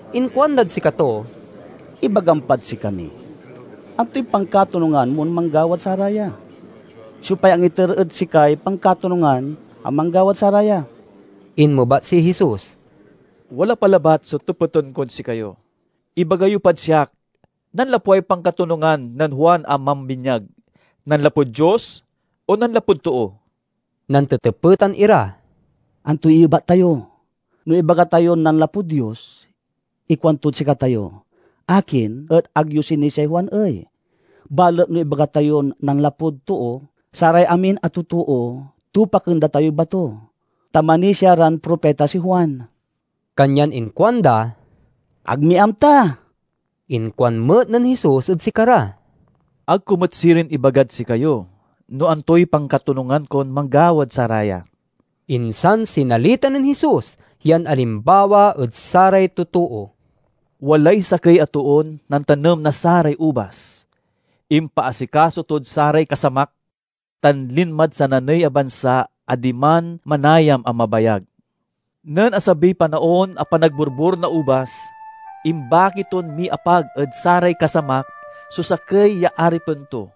Inkuandad sikato, "Ibagam pad sikami: antoy pankatonungan mon manggawad saraya? Siopay angiter ed sikay pankatonungan a manggawad saraya?" Inmebat si Jesus, "Wala pa labat so tepeten kod sikayo. Ibaga yo pad siak: nanlapway pankatonungan nen Juan a mambinyag, nanlapud Dios o nanlapud too?" Nantetepetan ira, "Antoy iyebat tayo? No ibaga tayon nanlapud Dios, ikuantod sikatayo, 'Akin et ag yo sinisiay Juan ey?' Balet no ibaga tayon nanlapud too, saray amin a totoo tupaken da tayoy bato, ta manisia ran propita si Juan." Kanyan inkuanda, "Ag mi amta!" Inkuan met nen Jesus ed sikara, "Ag ko met sirin ibagad sikayo no antoy pankatonungan kon manggawad saraya." Insan sinalita nen Jesus yan alimbawa ed saray totoo, "Walay sakey a toon nantanem na saray ubas. Impaasikaso tod saray kasamak, tan linmad sananey a bansa a diman manayam a mabayag. Nen asabiy panaon a panagborbor na ubas, imbaki ton miapag ed saray kasamak so sakey ya aripen to.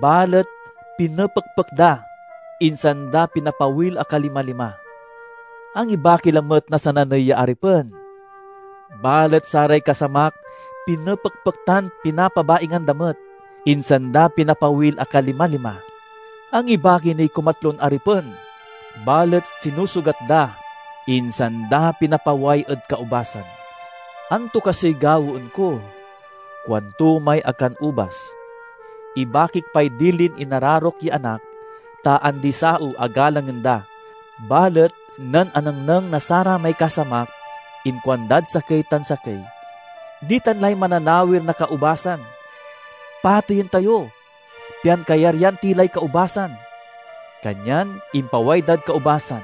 Balet pinepekpek da, insan da pinapawil a kalimalima. Angibaki lamet na sananey ya aripen, balet saray kasamak pinepekpek tan pinapabaingan da met, insan da pinapawil a kalima-lima. Angibaki niy kumatlon aripen, balet sinusugat da, insan da pinapaway ed kaubasan. 'Anto kasiy gawaen ko?' kuanto may akanubas. 'Ibakik pay dilin inararok ya anak, ta andi-saew a galangen da!' Balet nen anengneng na saramay kasamak, inkuandad sakey tan sakey, 'Nitan lay mananawir na kaubasan. Pateyen tayo, pian kayaryan ti lay kaubasan!' Kanyan impaway dad kaubasan,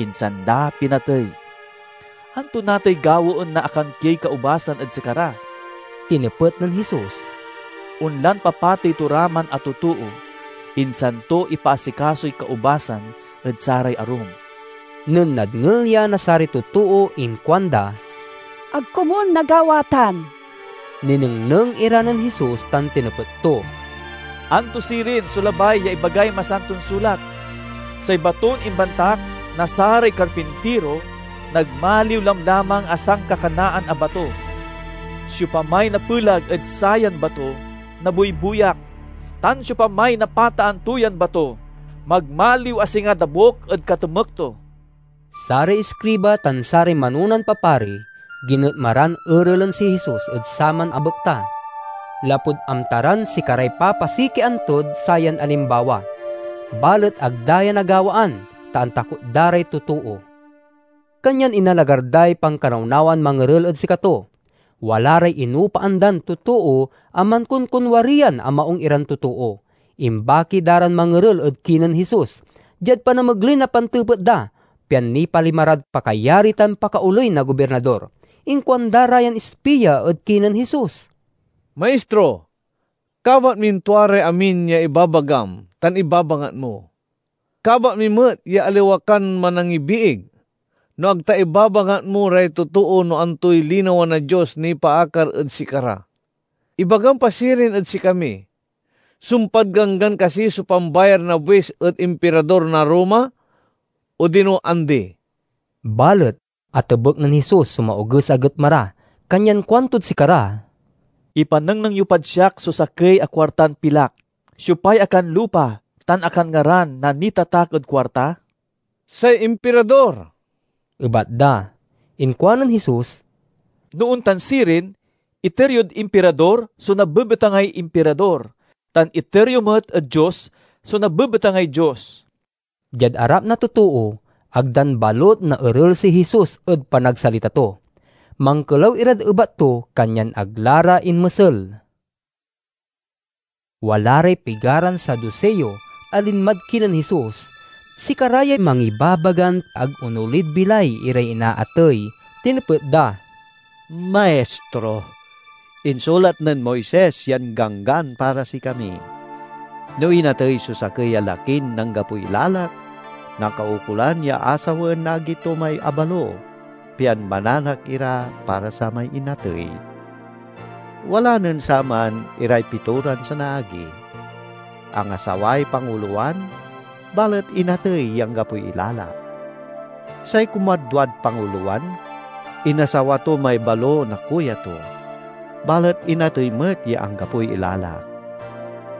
insan da pinatey. "Anto natay gawaen na akankiey kaubasan ed sikara?" tinepet nen Jesus. "Onlan papatey to ra man a totoo, insan to ipaasikasoy kaubasan ed saray arum." Nen nadngel ya na saray totoo inkuanda, "Ag komun nagawa tan!" Ninengneng ira nen Jesus tan tinepet to, "Anto sirin so labay ya ibagay Masanton Sulat? 'Say baton imbantak na saray karpintiro, nagmaliw lamlamang a sankakanaan a bato.' Siopamay napeleg ed sayan bato, nabuybuyak. Tan siopamay napataan to yan bato, magmaliw a singa dabuk ed katemek to." Saray iskriba tan saray manonan papari ginetma ran erelen si Jesus ed saman a bekta, lapud amta ran sikaray papasikian tod sayan alimbawa. Balet ag da ya nagawaan, ta antakot da ray totoo. Kanyan inalagar day pankanawnawan mangerel ed sikato. Wala ray inopaan dan totoo a mankonkonwariyan a maung iran totoo. Imbaki da ran mangerel ed kinen Jesus, diad panamegley na pantepet da, pian nipalima rad pakayari tan pakaoley na Gobirnador. Inkuanda ra yan ispia ed kinen Jesus, "Maistro, kabat min tua ray amin ya ibabagam tan ibabangat mo. Kabat mi met ya aliwa kan manangibiig, no ag ta ibabangat mo ray totoo no antoy linawa na Dios nipaakar ed sikara. Ibagam pa sirin ed sikami: sumpad Ganggan kasi so pambayar na buis ed Impirador na Roma, odino andi?" Balet atebek nen Jesus so maoges a getma ra, kanyan kuantod sikara, "Ipanengneng yo pad siak so sakey a kuartan pilak. Siopay akanlupa tan akanngaran na nitatak ed kuarta?" "Say Impirador," ebat da. Inkuanen Jesus, "No ontan sirin, iter yo Impirador so nabebetangay Impirador, tan iter yo met ed Dios so nabebetangay Dios." Diad arap na totoo, ag dan balut naerel si Jesus ed panagsalita to. Mankelaw irad ebat to, kanyan ag la ra inmesel. Wala ray pigaran Saduseo a linmad kinen Jesus. (Sikara yay mangibabagan ag onolid bilay iray inaatey.) Tinepet da, "Maistro, insulat nen Moises yan ganggan para sikami: 'No inatey so sakey a lakin anggapoy ilalak, nakaukolan ya asawaen na agi to may abalo, pian mananak ira para samay inatey.' Wala nen saman iray pitoran sanaagi. Angasaway pangulowan, balet inatey ya anggapoy ilalak. Say kumadwad pangulowan inasawa to may balo na kuya to, balet inatey met ya anggapoy ilalak.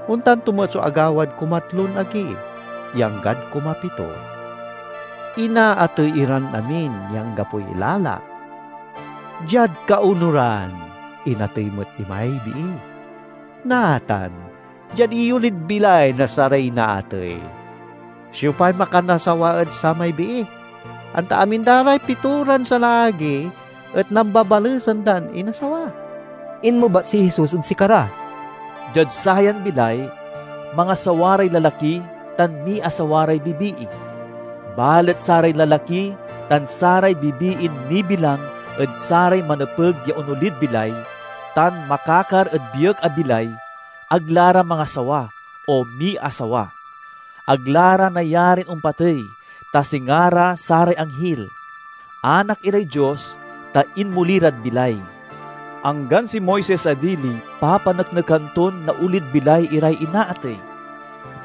Ontan to met so agawad kumatlon agi, ya anggad kumapito. Inaatey iran amin ya anggapoy ilalak. Diad kaonuran, inatey met imay bii. Natan, diad iyolid bilay na saray inaatey, siopay makanasawa ed samay bii, anta amin da ra may pitoran sanaagi et nambabalesan dan inasawa?" Inmebat si Jesus ed sikara, "Diad sayan bilay, mangasawa ray lalaki tan miasawa ray bibii. Balet saray lalaki tan saray bibiin nibilang ed saray manepeg ya onolid bilay, tan makakar ed biek a bilay, ag la ra mangasawa o miasawa. Ag la ra nayarin ompatey, ta singa ra saray anghil. Anak iray Dios, ta inmoli rad bilay. Anggan si Moises a dili papaneknekan ton naolid bilay iray inaatey.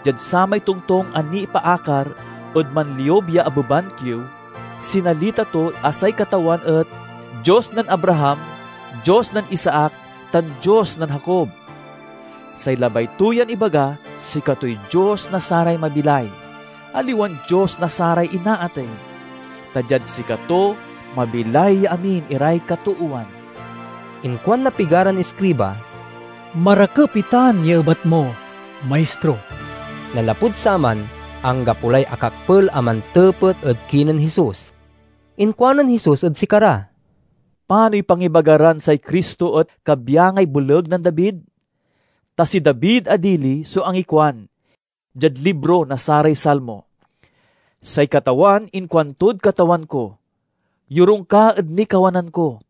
Diad samay tongtong a nipaakar ed manliub ya abeban kiew, sinalita to a say Katawan et 'Dios nen Abraham, Dios nen Isaac, tan Dios nen Jacob.' Say labay to yan ibaga sikatoy Dios na saray mabilay, aliwan Dios na saray inaatey, ta diad sikato mabilay ya amin iray katoowan." Inkuan na pigaran iskriba, "Marakep itan ya ebat mo, Maistro!" Nanlapud saman, anggapo lay akakpel a mantepet ed kinen Jesus. Inkuanen Jesus ed sikara, "Panoy pangibaga ran say Cristo et kabyangay boleg nen David? Ta si David a dili so angikuan, diad libro na saray Salmo: 'Say Katawan inkuantod Katawan ko: Yorung ka ed nikawanan ko,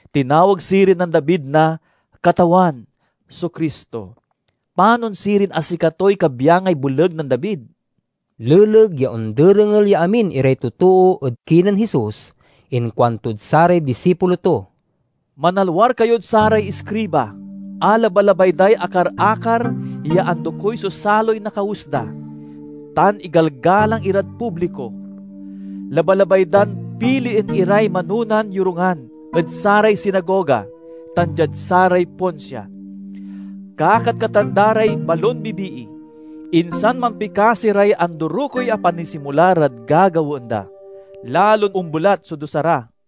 Tinawag sirin nen David na 'Katawan' so Cristo. Panon sirin a sikatoy kabyangay boleg nen David?" Leleg ya onderengel ya amin iray totoo ed kinen Jesus, inkuantod saray disipulo to, "Manalwar kayod saray iskriba, a labalabay day akar-akar ya andokey so saloy na kawes da, tan igalgalang irad publiko. Labalabay dan pilien iray manonan yorungan ed saray sinagoga tan diad saray ponsia. Kakatkatan da ray balon bibii, insan mampikasi ray andorokey a panisimula rad gagawaen da. Lalon ombelat so dusa ra!"